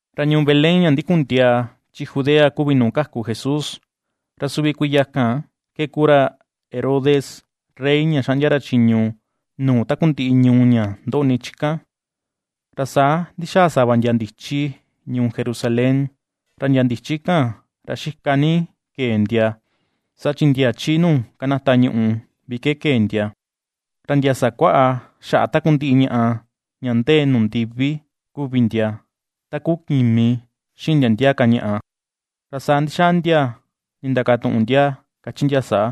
Ra ñuu Belén ña ndikun ndiaa chi Judea kuvi nuu kaku Jesús, ra suvi kuiya kan ke kuu ra Herodes rey ña ^xaꞌndia ra chiñu nuu takundiꞌi ñuu ña ndoꞌni chi kan; ra saa ndixaa sava ndia ndichi ñuu Jerusalén. Ra ndia ndichi kan, ra xika ni kee ndia, saa chi ndia chi nuu kanata ñuꞌu vi ke kee ndia; ra ndia sakuaꞌa xaꞌa takundiꞌi ñaꞌa ña ndee nuu ndivi kuvi ndia, ta kuu kimi xiꞌin ndia ndia ka ñaꞌa. Ra saa ndixaa ndia ndindakatuꞌun ndia kachi ndia saa: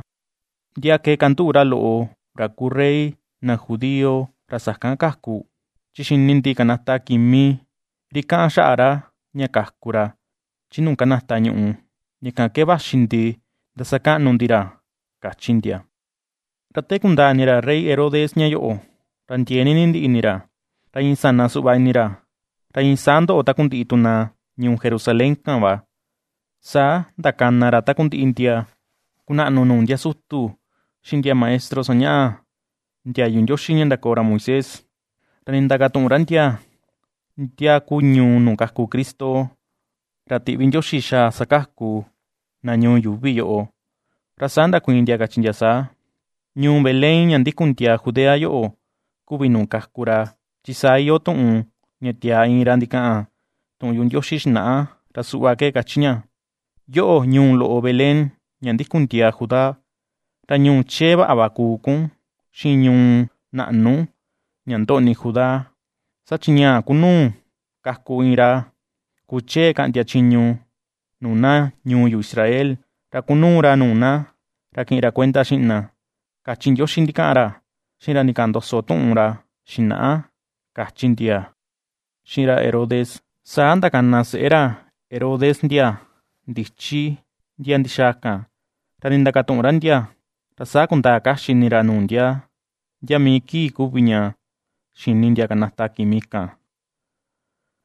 ―¿Ndia ke ^kanduꞌu ra loꞌo, ra kuu rey na Judío ra sakan kaku? Chi xini ndi kanata kimi ri kaꞌan xaꞌa ra ña kaku ra chi nuu kanata ñuꞌu, ña kan ke vaxi ndi ndasakaꞌnu ndi ra ―kachi ndia. Ra te kundaa ini ra rey Herodes ña yoꞌo, ra ndiee ni nindiꞌi ini ra, ra iin sana suꞌva ini ra, ra iin saa ndoꞌo takundiꞌi tu na ñuu Jerasalén kan va. Saa ndakana ra takundiꞌi ndia kunaꞌnu nuu ndia sutu, xiꞌin ndia maestro sañaꞌa ndiayu Ndioxi ña ndakoo ra Moisés, ra nindakatuꞌun ra ndia, ndia ku ñuu nuu kaku Cristo, ra tiꞌvi Ndioxi xaa sakaku na ñuu yuuvi yoꞌo. Ra saa ndakuiin ndia kachi ndia saa: ―Ñuu Belén ña ndikun ndiaa Judea yoꞌo kuvi nuu kaku ra; chi saa iyoo tuꞌun ña tiaa iin ra ndikaꞌan tuꞌun yuꞌu Ndioxi xinaꞌa. Ra suꞌva ke kachi ña: Yoꞌo, ñuu loꞌo Belén, ña ndikun ndiaa Judá, ra ñuu chee vaꞌa va kuu kun, xiꞌin ñuu naꞌnu ña ndoꞌni Judá; saa chi ñaa ku nuu kaku iin ra kuchee kaꞌndia chiñu nuu na ñuu yu Israel, ra kunuu ra nuu na, ra kiꞌin ra kuenda xiꞌin na, kachi Ndioxi ndikaꞌan ra, xiꞌin ra ndikaꞌan ndoso tuꞌun ra xinaꞌa ―kachi ndia xiꞌin ra Herodes. Saa ndakana seꞌe ra Herodes ndia ndichi ndia ndixaa kan, ra ndindakatuꞌun ra ndia, ra saa kundaa kaxi ini ra nuu ndia, ndia mii kii kuvi ña xini ndia kanata kimi kan.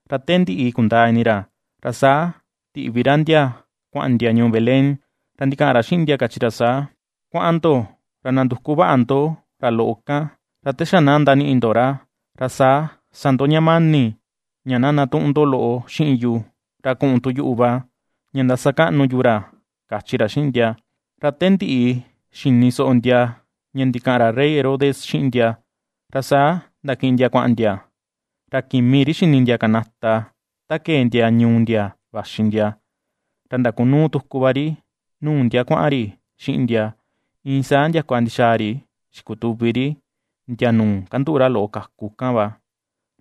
Ra te ndiꞌi kundaa ini ra, ra saa tiꞌvi ra ndia kuaꞌan ndia ñuu Belén, ra ndikaꞌan ra xiꞌin ndia kachi ra saa: ―Kuaꞌan ndo ra nanduku vaꞌa ndo ra loꞌo kan, ra te xa na ndaniꞌi ndo ra, ra saa sa ndo ña mani ña na ndatuꞌun ndo loꞌo xiꞌin yu, ra kuꞌun tu yuꞌu va ña ndasakaꞌnu yu ra ―kachi ra xiꞌin ndia. Ra te ndiꞌi xini soꞌo ndia ña ndikaꞌan ra rey Herodes xiꞌin ndia, ra saa ndakiꞌin ndia kuaꞌan ndia. Ra kimi ri xini ndia kanata ta kee ndia ñuu ndia vaxi ndia, ra ndakunuu tuku va ri nuu ndia kuaꞌan ri xiꞌin ndia, iin saa ndiakua ndixaa ri xikutuvi ri ndia nuu kanduꞌu ra loꞌo kaku kan.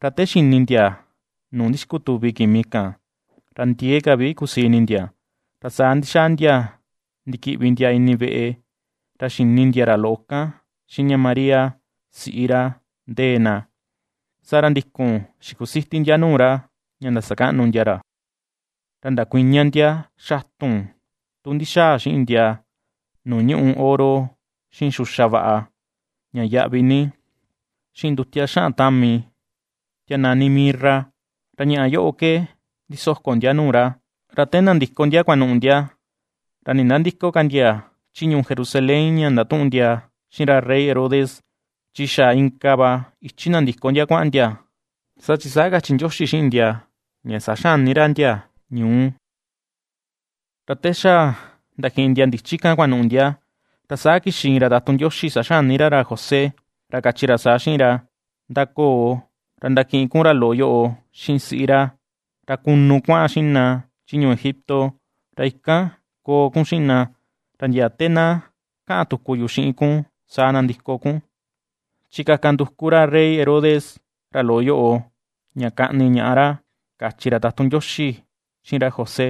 Ra te xini ndia nuu ndixikutuvi kimi kan, ra ndiee ka vi kusii ini ndia. Ra saa ndixaa ndia ndikiꞌvi ndia ini veꞌe, ra xini ndia ra loꞌo kan xiꞌin ña María, siꞌi ra ndee na, saa ra ndikun xikusiti ndia nuu ra, ña ndasakaꞌnu ndia ra; ra ndakuiña ndia xatun tu ndixaa xiꞌin ndia nuu ñuꞌu oro, xiꞌin xuxa vaꞌa ña yaꞌvi ni, xiꞌin ndutia xaꞌan tami tia nani “mirra” ra ñaꞌa yoꞌo ke ndisoko ndia nuu ra. Ra te nandiko na kuanuꞌu ndia, ra nindandïko ka ndia chi ñuu Jerusalén ña ndatuꞌun ndia xiꞌin ra rey Herodes, chi xa inka va ichi nandiko ndia kuaꞌan ndia, saa chin saa kachi Ndioxi xiꞌin ndia ña saxani ra ndia ñuu. Ra te xa ndakiꞌin na ndichi kan kuanuꞌu ndia, ra saa kixi iin ra tatun Ndioxi saxani ra ra José, ra kachi ra saa xiꞌin ra: ―^Ndakoo, ra ndakiꞌin kun ra loꞌo yoꞌo xiꞌin siꞌi ra, ra kunu kuaꞌan xiꞌin na chi ñuu Egipto, ra ikan koo kun xiꞌin na, ra ndia te na kaꞌan tuku yu xiꞌin kun saa nandiko kun, chi kaka nduku ra rey Herodes ra loꞌo yoꞌo ña kaꞌni ñaꞌa ra ―kachi ra tatun Ndioxi xiꞌin ra José.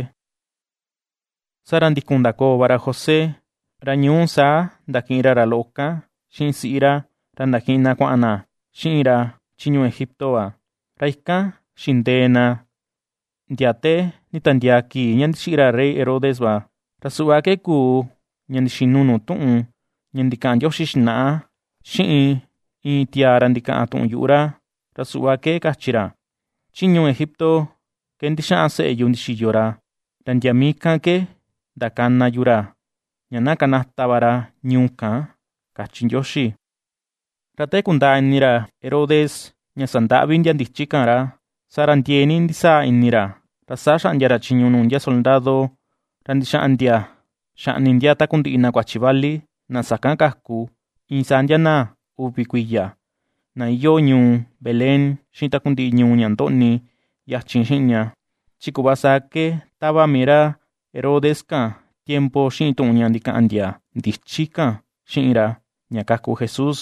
Saa ra ndikun ndakoo va ra José, ra ñuu saa ndakiꞌin ra ra loꞌo kan xiꞌin siꞌi ra, ra ndakiꞌin ra na kuaꞌan na xiꞌin ra chi ñuu Egipto va. Ra ikan xindee na ndia te nditiandiaa kii ña ndixiꞌi ra rey Herodes va. Ra suꞌva ke kuu, ña ndixinu nuu tuꞌun, ña ndikaꞌan Ndioxi xinaꞌa, xiꞌin iin tiaa ra ndikaꞌan tuꞌun yuꞌu ra, ra suꞌva ke kachi ra: “Chi ñuu Egipto ke ndixaꞌan seꞌe yu ndixiyo ra, ra ndia mii kan ke ndakana yu ra ña na kanata va ra ñuu kan”, kachi Ndioxi. Ra te kundaa ini ra Herodes ña sandaꞌvi na ndichi kan ra, saa ra ndiee ni ndisaa ini ra, ra saa xaꞌndia ra chiñu nuu ndia soldado, ra ndixaꞌan ndia xaꞌni ndia takundiꞌi na kuachi vali, na sakan kaku, iin saa ndia na uvi kuiya, na iyoo ñuu Belén xiꞌin takundiꞌi ñuu ña ndoꞌni yachin xiꞌin ña; chi kuꞌva saa ke tava mii ra Herodes kan tiempo xiꞌin tuꞌun ña ndikaꞌan ndia ndichi kan xiꞌin ra, ña kaku Jesús.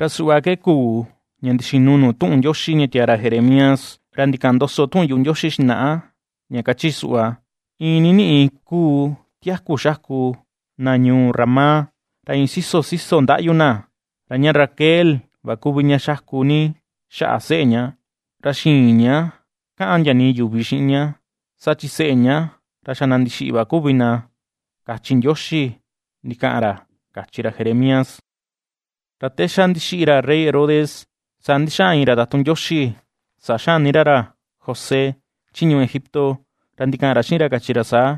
Ra suꞌva ke kuu ña ndixinu nuu tuꞌun Ndioxi ña tiaa ra Jeremías, ra ndikaꞌan ndoso tuꞌun yuꞌu Ndioxi xinaꞌa, ña kachi suꞌva: Iin niniꞌi ^kuu tiaku xaku na ñuu Ramá, ra iin siso siso ndaꞌyu na. Ra ña Raquel va kuvi ña xaku ni xaꞌa seꞌe ña, ra xïin ña kaꞌan ndia nii yuvi xiꞌin ña, saa chi seꞌe ña ra xa na ndixiꞌi va kuvi na, kachi Ndioxi ndikaꞌan ra, kachi ra Jeremías. Ra te xa ndixiꞌi ra rey Herodes, saa ndixaꞌan iin ra tatun Ndioxi saxani ra ra José chi ñuu Egipto, ra ndikaꞌan ra xiꞌin ra kachi ra saa: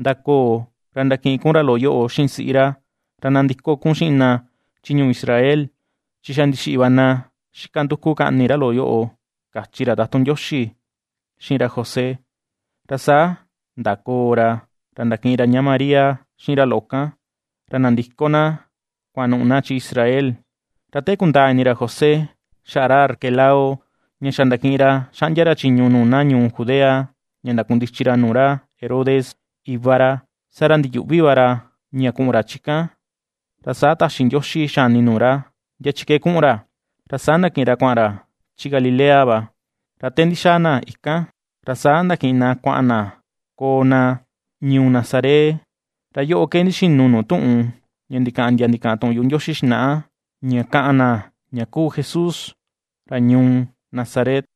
―Ndakoo, ra ndakiꞌin kun ra loꞌo yoꞌo xiꞌin siꞌi ra, ra nandiko kun xiꞌin na chi ñuu Israel, chi xa ndixiꞌi va na xika nduku kaꞌni ra loꞌo yoꞌo ―kachi ra tatun Ndioxi xiꞌin ra José. Ra saa ndakoo ra, ra ndakiꞌin ra ña Maria xiꞌin ra loꞌo kan, ra nandiko na kuanuꞌu na chi Israel. Ra te kundaa ini ra José xaꞌa ra Arquelao ña xa ndakiꞌin ra xaꞌndia ra chiñu nuu na ñuu Judea ña ndakundichi ra nuu ra Herodes, iva ra, saa ra ndiyuꞌvi va ra ña kuꞌun ra chi kan; ra saa taxi Ndioxi xani nuu ra, ndia chi ke kuꞌun ra, ra saa ndakiꞌin ra kuaꞌan ra chi Galilea va. Ra te ndixaa na ikan, ra saa ndakiꞌin na kuaꞌan na koo na ñuu Nazaret, ra yoꞌo ke ndixinu nuu tuꞌun ña ndikaꞌan ndia ndikaꞌan tuꞌun yuꞌu Ndioxi xinaꞌa: Ña kaꞌan na ña kuu Jesús ra ñuu Nazaret.